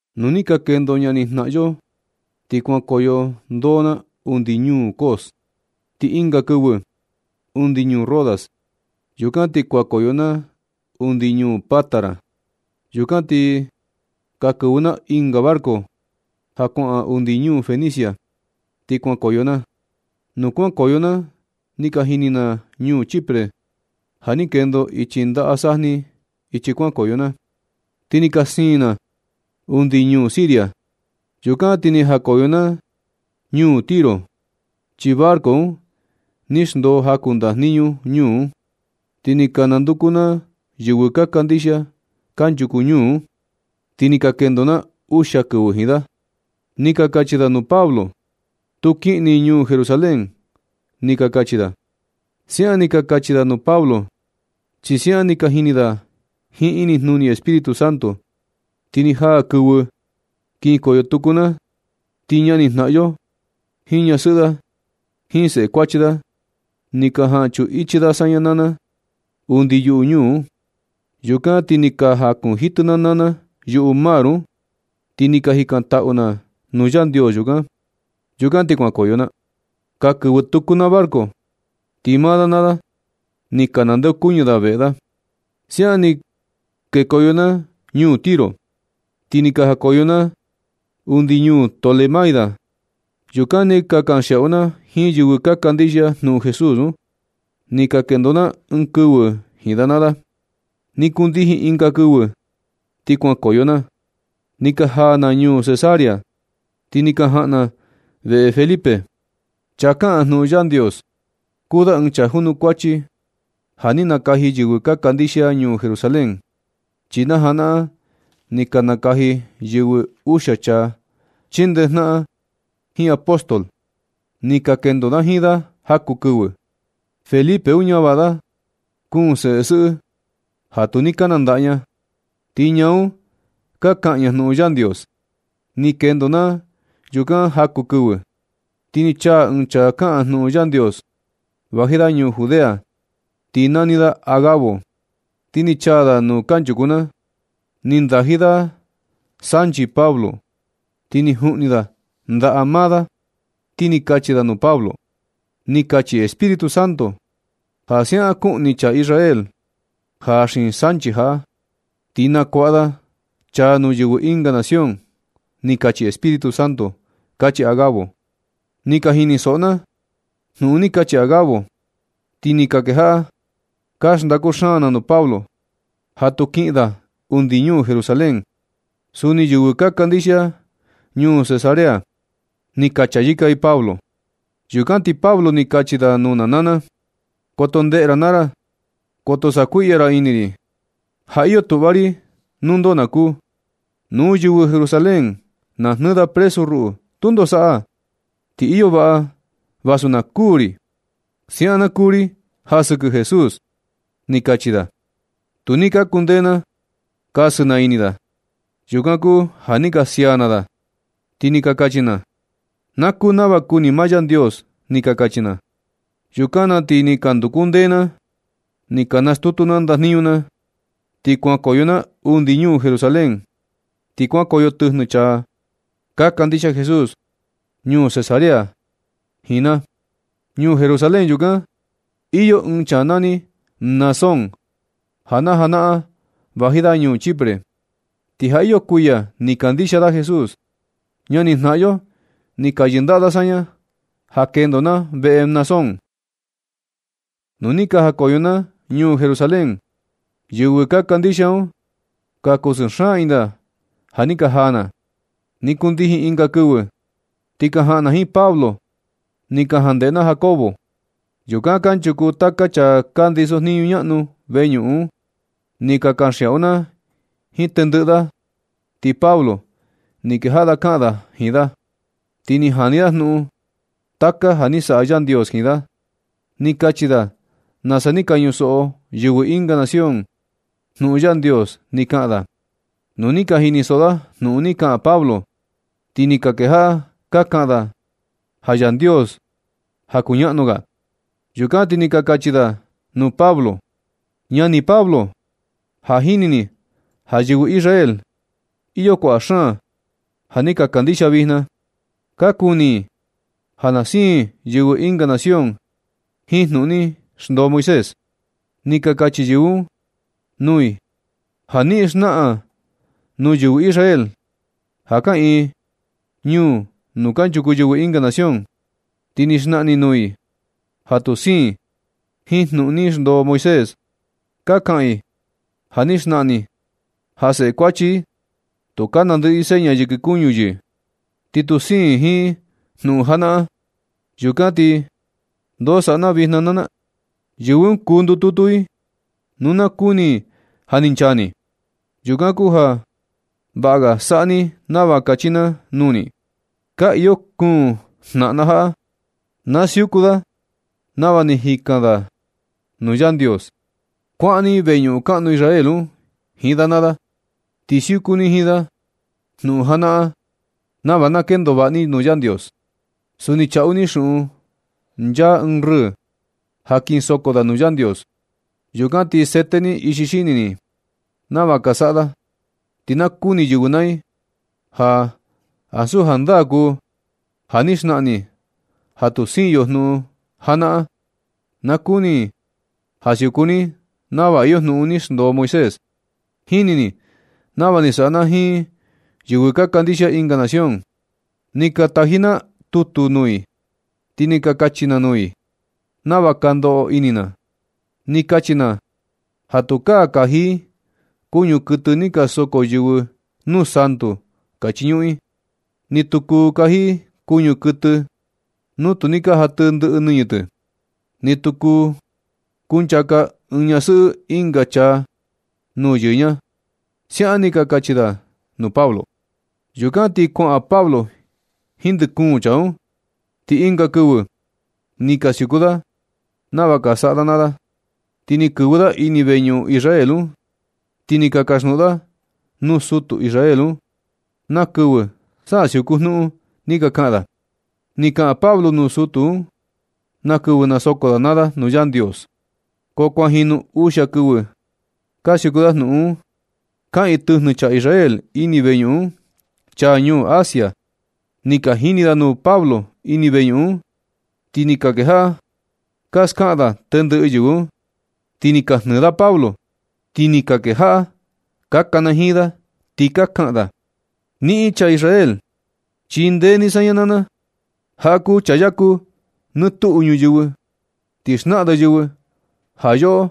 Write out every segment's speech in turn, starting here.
Nu ni ka kendo ñanijnaꞌan yo, ti kuankoyo ndoo na undi ñuu Cos, ti ɨnga kɨvɨ, undi ñuu Rodas. Yukan ti kuankoyo na undi ñuu Pátara. Yukan ni ka kɨvɨ na ɨnga barco ja kuaꞌan undi ñuu Fenicia, ti kuankoyo na. Nu kuankoyo na ni ka jini na ñuu Chipre ja ni kendo ichi ndaꞌa sajni ichi kuankoyo na, ti ni ka siin na undi ñuu Siria. Yukan ti ni jakoyo na ñuu Tiro, chi barco un ni xndoo jaku ndajniñu ñuu un. Ti ni ka nanduku na yɨvɨ ka kandixia kanchuku ñuu un, ti ni ka kendo na uxia kɨvɨ jiin da. Ni ka kachi da nuu Pablo: ―Tu kiꞌin ni ñuu Jerusalén ―ni ka kachi da. Siaꞌan ni ka kachi da nuu Pablo, chi siaꞌan ni ka jini da jiin inijnuni Espíritu Santo. Ti ni jaa kɨvɨ kinkoyo tuku na, ti ñanijnaꞌan yo jiin ñasɨꞌɨ da, jiin seꞌe kuachi da, ni ka jan chuꞌun ichi da saña naa na undi yuꞌu ñuu un. Yukan ti ni ka jakunjitɨ naa na na yuꞌu mar un, ti ni ka jikantaꞌu na nuu Yandios yukan. Yukan ti kuankoyo na. Ka kɨvɨ tuku na barco, ti maa da naa da, ni ka nandeokuñɨ da veꞌe da. Siaꞌan ni kekoyo na ñuu Tiro, ti ni ka jakoyo na undi ñuu Tolemaida. Yukan ni ka kanxiaꞌu na jiin yɨvɨ ka kandixia jnuꞌun Jesús un. Ni ka kendo na ɨɨn kɨvɨ jiin da naa da. Ni kundijin ɨnga kɨvɨ ti kuankoyo na. Ni ka jaa na ñuu Cesarea, ti ni ka jaꞌan na veꞌe Felipe, chaa kaꞌan jnuꞌun Yandios. Kuu da ɨɨn chaa junukuachi ja ni nakaji yɨvɨ ka kandixia ñuu Jerusalén, chi na janaꞌan ni ka nakaji yɨvɨ uxia chaa chindejnaꞌan jiin apóstol. Ni ka kendo na jiin da jaku kɨvɨ. Felipe un ñavaꞌa da kuun sesɨꞌɨ da, ja tu ni ka nandaꞌa ña, ti ñaa un ka kaꞌan ña jnuꞌun Yandios. Ni kendo na yukan jaku kɨvɨ, ti ni chaa ɨɨn chaa kaꞌan jnuꞌun Yandios. Vaji da ñuu Judea, ti nani da Agabo. Ti ni chaa da nuu kanchuku na. Ni ndaji da sanchi Pablo, ti ni juꞌni da ndaꞌa maa da, ti ni kachi da nuu Pablo: ―Ni kachi Espíritu Santo ja siaꞌan kuꞌni chaa Israel ja xiin sanchi jaꞌa, ti nakuaꞌa da chaa nuu yɨvɨ ɨnga nación, ni kachi Espíritu Santo ―kachi Agabo. Ni ka jinisoꞌo na jnuꞌun ni kachi Agabo, ti ni ka kejaꞌa ka xndaku na nuu Pablo ja tu kiꞌin da undi ñuu Jerusalén. Suni yɨvɨ ka kandixia ñuu Cesarea, ni ka chayɨka i Pablo. Yukan ti Pablo ni kachi da nuu na naa na: ―Koto ndeꞌe ra naa ra. Koto sakuiꞌya ra ini ri. Ja iyo tuꞌva ri nuu ndoo na kuu. Nu yɨvɨ Jerusalén na jnɨɨ da presu ruꞌu tundo saꞌa, ti iyo vaꞌa vasu na kuū ri. Siaꞌan na kuu ri ja sɨkɨ Jesús ―ni kachi da. Tu ni ka kundee na kasɨ na ini da. Yukan kuu ja ni ka sia na da, ti ni ka kachi na: ―Na kuu nava kuni maa Yandios ―ni ka kachi na. Yukan na ti ka nduku ndee na ni ka stutu na ndajniñu na, ti kuankoyo na undi ñuu Jerusalén. Ti kuankoyo tɨjnɨ chaa ka kandixia Jesús ñuu Cesarea jiin na. Ñuu Jerusalén yukan, iyo ɨɨn chaa nani Mnasón, ja najanaꞌan vaji da ñuu Chipre, ti ja iyo kuiya ni kandixia da Jesús. Ñanijnaꞌan yo ni ka yɨndaꞌa da saña ja kendo na veꞌe Mnasón. Yukan ti ni jakoyo na ñuu Jerusalén. Yɨvɨ ka kandixia un, ka kusɨɨ xaan ini da ja ni ka jaa na. Ni kundijin ɨnga kɨvɨ, ti ka jaꞌan na jiin Pablo ni ka jandeꞌe na Jacobo. Yukan kanchuku taka chaa ka ndisojniñu ñaꞌnu veñuꞌun un. Ni ka kanxiaꞌu na jiin tendɨꞌɨ da, ti Pablo ni kejaꞌa da kaꞌan da jiin da, ti ni jani da jnuꞌun taka ja ni saꞌa Yandios jiin da. Ni kachi da nasa ni ka ñusoꞌo yɨvɨ ɨnga nación jnuꞌun Yandios ni kaꞌan da. Nu ni ka jinisoꞌo da jnuꞌun ni kaꞌan Pablo, ti ni ka kejaꞌa ka kaꞌan da ja Yandios ja kuñaꞌnu ga. Yukan ti ni ka kachi da nuu Pablo: ―Ñani Pablo, ja jini ni ja yɨvɨ Israel, iyo kuaꞌa xaan ja ni ka kandixia vijna. Ka kuni i ja na siin yɨvɨ ɨnga nación jiin jnuꞌun ni xndoo Moisés. Ni ka kachi yɨvɨ un nuu i ja niꞌin xnaꞌan nuu yɨvɨ Israel ja kaꞌiin ñuu nuu kanchuku yɨvɨ ɨnga nación, ti ni xnaꞌan ni nuu i ja tu siin i jiin jnuꞌun ni xndoo Moisés. Ka kaꞌan i ja ni xnaꞌan ni ja seꞌe kuachi i, tukaa nandɨꞌɨ seña yɨkɨ kuñu yɨ, ti ni tu siin i jiin jnuꞌun janaꞌan. Yukan ti, ¿ndo saꞌa na vijna na naa? Yɨvɨ un kuu ndututu i, nu na kuni i ja ni chaa ni. Yukan kuu ja vaꞌa ga saꞌa ni nava kachi na nuu ni. Ka iyo kuun jnaꞌan na jaꞌa. Na siuku da nava ni jikan da nuu Yandios. Kuaꞌan ni veñuꞌun kaꞌnu Israel un jiin da naa da, ti siuku ni jiin da jnuꞌun janaꞌan, nava na kendo vaꞌa ni nuu Yandios. Suni chaꞌu ni xuꞌun nchaa ɨɨn rɨɨ ja kin soko da nuu Yandios. Yukan ti sete ni ixi xini ni nava ka saꞌa da, ti na kuni yɨvɨ naa i ja ansu jandaa kuu ja ni xnaꞌan ni ja tu siin yo jnuꞌun janaꞌan. Na kuni i ja siuku ni nava iyo jnuꞌun ni xndoo Moisés. Jini ni nava ni saꞌa na jiin yɨvɨ ka kandixia ɨnga nación. Ni ka taji na tutu nuu i ti ni ka kachi na nuu i nava ka ndoꞌo ini na. Ni kachi na ja tukaa kaji i kuñu kuɨtɨ ja ni ka soko yɨvɨ nuu santu ka nchañuꞌun i. Ni tu kuu kaji i kuñu kuɨtɨ nu tu ni jatɨ ndɨꞌɨ nɨñɨ tɨ. Ni tu kuu kunchaka ɨɨn ñasɨꞌɨ ɨnga chaa nuu yɨɨ ña ―siaꞌan ni ka kachi da nuu Pablo. Yukan ti kuaꞌan Pablo jiin ndɨ kuun chaa un, ti ɨnga kɨvɨ ni ka siuku da nava ka saꞌa da naa da, ti ni kɨvɨ da ini veñuꞌun Israel un, ti ni ka kasjnuꞌun da nuu sutu Israel un na kɨvɨ sa siuku jnuꞌun ni ka kaꞌan da. Ni kaꞌan Pablo nuu sutu un na kɨvɨ nasoko da naa da nuu Yandios. Ko kuan jinu uxia kɨvɨ ka siuku da jnuꞌun un. Kaꞌiin tɨjnɨ chaa Israel ini veñuꞌun un, chaa ñuu Asia. Ni ka jini da nuu Pablo ini veñuꞌun un, ti ni ka kejaꞌa ka skaꞌan da tendɨꞌɨ yɨvɨ un. Ti ni ka jnɨɨ da Pablo, ti ni ka kejaꞌa ka kanajiin da, ti ka kaꞌan da: ―¡Niꞌin chaa Israel, chindee ni saña naa na! Jaꞌa kuu chaa yaku nɨ tuꞌu ñuyɨvɨ, ti xnaꞌan da yɨvɨ ja yoꞌo,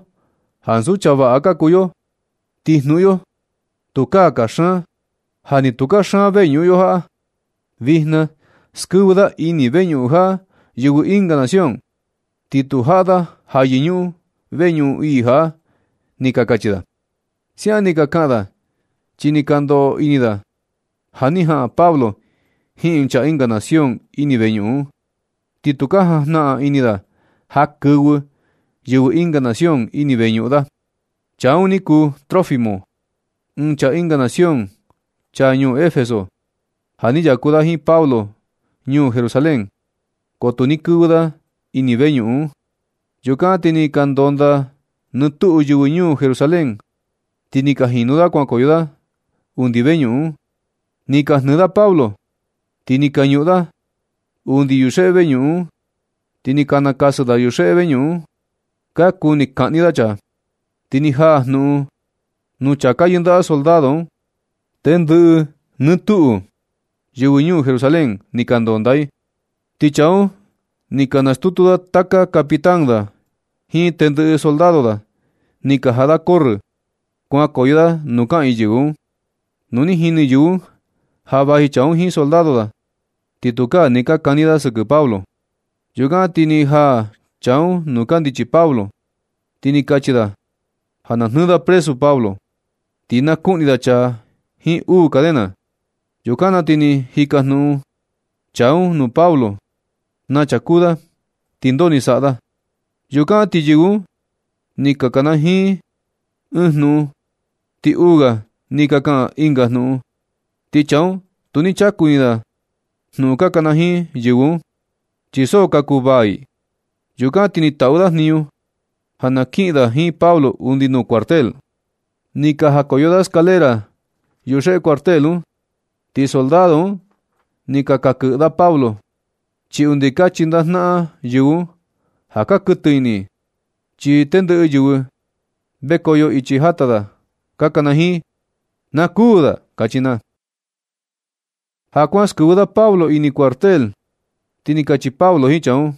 ansu chaa vaꞌa ka kuu yo, ti jnuꞌun yo tukaa kaxan, ja ni tu kaxan veñuꞌun yo jaꞌa. Vijna skɨvɨ da ini veñuꞌun jaꞌa yɨvɨ ɨnga nación, ti tu jaꞌa da ja yɨñuꞌun veñuꞌun ii jaꞌa ―ni ka kachi da. Siaꞌan ni ka kaꞌan da, chi ni ka ndoꞌo ini da ja ni jaꞌan Pablo jiin ɨɨn chaa ɨnga nación ini veñuꞌun un, ti tu ka jajnaꞌan ini da ja kɨvɨ yɨvɨ ɨnga nación ini veñuꞌun da. Chaa un ni kuu Trófimo, ɨɨn chaa ɨnga nación, chaa ñuu Efeso, ja ni yaku da jiin Pablo ñuu Jerusalén, ko tu ni kɨvɨ da ini veñuꞌun un. Yukan ti ni ka ndondaa nɨ tuꞌu yɨvɨ ñuu Jerusalén, ti ni ka jinu da kuankoyo i undi veñuꞌun un. Ni ka jnɨɨ da Pablo, ti ni ka ñuꞌun da da undi yuxeꞌe veñuꞌun un, ti ni ka nakasɨ da yuxeꞌe veñuꞌun un. Ka kuni kaꞌni da chaa, ti ni jaa jnuꞌun un nuu chaa yɨndaꞌa soldado un, tendɨꞌɨ te tuꞌu yɨvɨ ñuu Jerusalén ni ka ndondaa i. Ti chaa un ni na stutu da taka capitán da, jiin tendɨꞌɨ soldado da, ti ka jaꞌa da corrɨ kuankoyo da nuu kaꞌiin yɨvɨ un. Nu ni jini yɨvɨ un ja vaji chaa un jiin soldado da, ti tukaa ni ka kani da sɨkɨ Pablo. Yukan ti ni jaa chaa un nuu kandichi Pablo, ti ni kachi da ja na jnɨɨ da presu Pablo, ti na kuꞌni da chaa jiin uu cadena. Yukan na ti ni jikajnuꞌun chaa un nuu Pablo na chaa kuu da, ti ndoo ni saꞌa da. Yukan ti yɨvɨ un ni ka kanajiin ɨɨn jnuꞌun, ti uu ga ni ka kaꞌan ɨnga jnuꞌun. Ti chaa un tu ni chaku ini na jnuꞌun ka kanajiin yɨvɨ un, chi so ka kuvaa ii. Yukan ti ni taꞌu da jniñu ja na kiꞌin da jiin Pablo undi nuu cuartel. Ni ka jakoyo da escalera yuxeꞌe cuartel un, ti soldado un ni ka kakɨꞌɨ da Pablo, chi undi ka chindaꞌa jnaꞌan yɨvɨ un ja ka kuɨtɨ ini i. Chi tendɨꞌɨ yɨvɨ vekoyo ichi jata, ka kanajiin: ―¡Na kuū da! ―kachi na. Ja kuaꞌan skɨvɨ da Pablo ini cuartel, ti ni kachi Pablo jiin chaa un: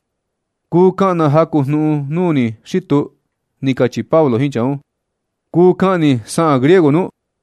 ―Kuu kaꞌan na jaku jnuꞌun nuu ni xi tuu ―ni kachi Pablo jiin chaa un: ―¿Kuu kaꞌan ni saꞌan griego nu?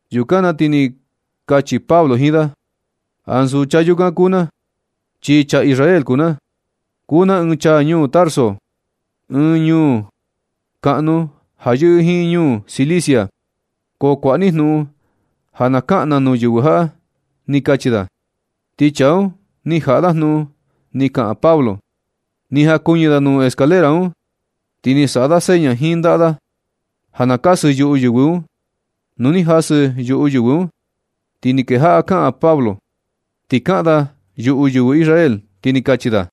Yukan na ti ni kachi Pablo jiin da: ―Ansu chaa yukan kuu na, chi chaa Israel kuu na. Kuu na ɨɨn chaa ñuu Tarso, ɨɨn ñuu kaꞌnu ja yɨꞌɨ jiin ñuu Cilicia. Ko kuaꞌa ni jnuꞌun ja na kaꞌan na nuu yɨvɨ jaꞌa ―ni kachi da. Ti chaa un ni jaꞌa da jnuꞌun ni kaꞌan Pablo, ni jakuɨñɨ da nuu escalera un, ti ni saꞌa da seña jiin ndaꞌa da ja na kasɨ yuꞌu yɨvɨ un. Nu ni ka jasɨ yuꞌu yɨvɨ un, ti ni kejaꞌa kaꞌan Pablo. Ni kaꞌan da yuꞌu yɨvɨ Israel, ti ni kachi da: